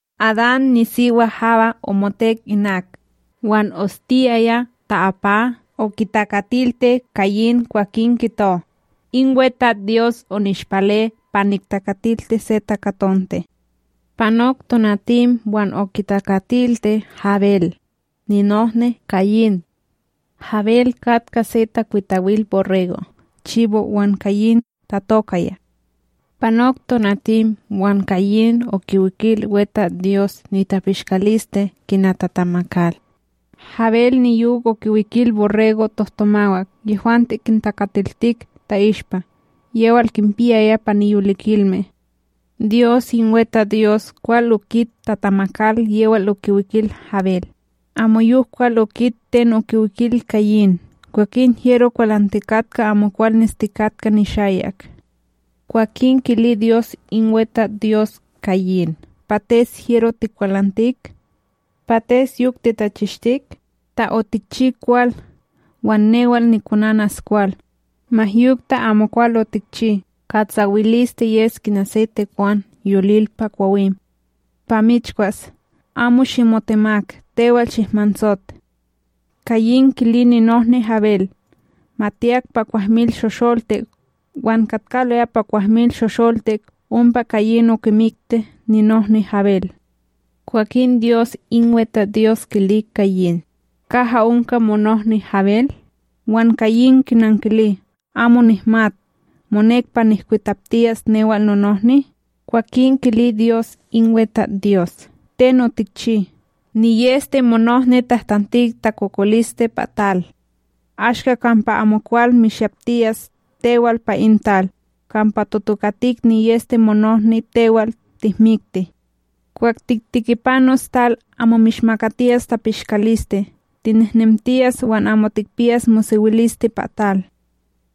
Adan nisiwa Hawa omotek inak, wan ostiyaya ta'apa okitakatilti Kayin. Kwakin kito: “In WeTatsDyos onishpale pa niktakatilti se takatonte!” Panok tonatim wan okitakatilti Habel, ninohni Kayin. Habel katka se takwitawil borrego', chibo' wan Kayin tatokaya. Panok tonatim, wan Kayin okiwikil WeTatsDyos nitapishkaliste kina tatamakal. Habel niyok okiwikil borrego' tohtomawak, yehwante kintakatiltik ta'ishpa yewal kinpiyaya pa niyolikilme. Dyos in WeTatsDyos kwal okit tatamakal yewal okiwikil Habel, amoyok kwal okit ten okiwikil Kayin. Kwakin hyero kwalantikatka amokwal nestikatka nishayak. Kwakin kili Dyos in WeTatsDyos Kayin: “Pates hyero tikwalantik? Pates yok titachishtik? Ta otikchi kwal, wan newal nikonanas kwal. Ma yok ta amokwal otikchi, katsawiliste yes kina se tekwan yolil pa kwawim, pa michkwas. Amo shimotemak, tewal shikmansot.” Kayin kili ninohni Habel. Ma tiyak pa kwahmilShosholtik, wan katkaloya pa kwahmilShosholtik ompa Kayin okimikti ninohni Habel. Kwakin Dyos in WeTatsDyos kili Kayin: ―Kaha onka monohni Habel? Wan Kayin kinankili: ―Amo nihmat. Monek pa nihkwitaptiyas newal nonohni? Kwakin kili Dyos in WeTatsDyos: ―Ten otikchi! NiyEste monohni tahtantik takokoliste pa tal. Ashka kampa amokwal mishyaptiyas tewal pa in tal, kampa totokatik niyEste monohni tewal tihmikti. Kwah tiktikipanos tal, amo mishmakatiyas tapishkaliste, tinehnemtiyas wan amo tikpiyas mosewiliste pa tal.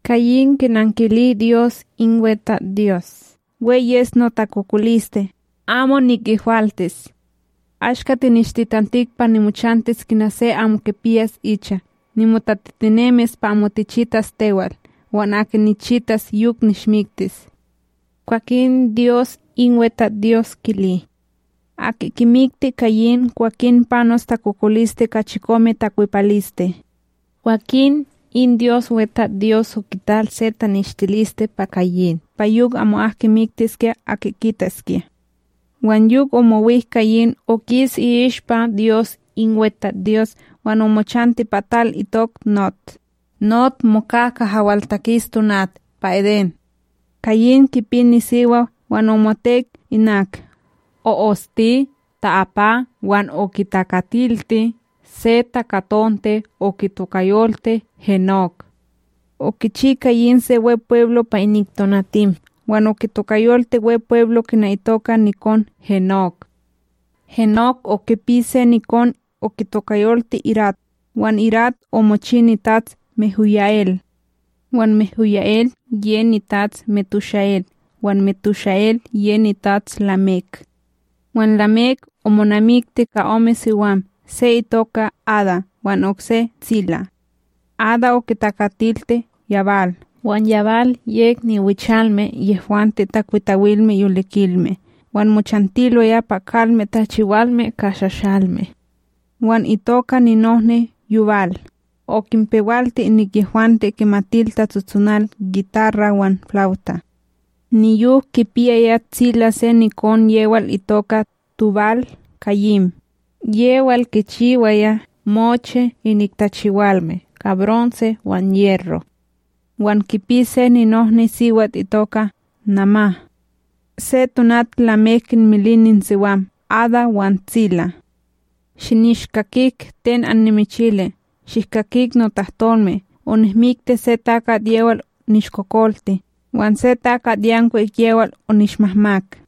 Kayin kinankili Dyos in WeTatsDyos: ―We yes notakokoliste amo nikehwaltis. Ashka tinishtitantik pa nimochantis kina se amo kipiyas icha, nimotatitinemis pa amo tichitas tewal, wan aki nichitas yok nishmiktis. Kwakin Dyos in WeTatsDyos, kili: ―Aki kimikti Kayin, kwakin panos takokoliste ka chikome takwepaliste. Kwakin in Dyos WeTastsDyos okital se taneshtililiste pa Kayin, pa yok amo'ak kimiktiskya aki kitaskya. Wan yok omowik Kayin, okis i'ishpa Dyos in WeTatsDyos wan omochanti pa tal itok Nod, Nod moka kaha waltakis tonat pa Edén. Kayin kipi nisiwa wan omotek inak, o'osti ta'apa wan okitakatilti se takatonte okitokayolti Henok. Okichi Kayin se Wepweblo pa inik tonatim, wan okitokayolti Wepweblo kina itoka nikon Henok. Henok okipi se nikon okitokayolti Irad, wan Irad omochi nitats MehuyaEl, wan MehuyaEl ye nitats MetushaEl wan MetushaEl ye nitats Lamek. Wan Lamek omonamikti ka ome siwam. Se itoka Ada wan okse Tsilá. Ada okitakatilti Yabal, wan Yabal yek niwichalme yehwante takwitawilme yolikilme wan mochantiloya pa kalme tachiwalme ka shashalme. Wan itoka ninohni Yubal, okinpewalti inik yehwante kimatil tatsotsonal gitarra wan flawta. Niyok kipiyaya Tsilá se nikon yewal itoka Tubal-kayín, yewal kichiwaya mochi inik tachiwalme ka bronse wan yerro. Wan kipi se ninohniSiwat itoka Namá. Se tonat Lamek kinmili ininsiwam Ada wan Tsilá: “Shinishkakik ten annimichilis! Shihkakik notahtolme! Onihmikti se takat yewal nishkokolti, wan se takatYankwik yewal onishmahmak.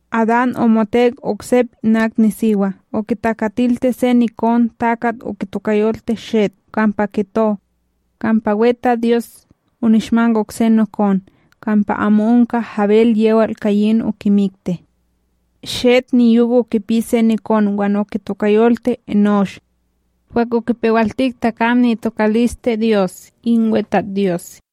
Adán omotek oksep inak nisiwa, okitakatilti se nikonTakat okitokayolti Shet, kampa kito: “Kampa WeTatsDyos onishmak okse nokon kampa amo onka Habel yewal Kayin okimikti.” Shet niyok okipi se nikon wan okitokayolti Enósh. Kwah okipewaltik takam ni'itokaliste Dyos in WeTatsDyos.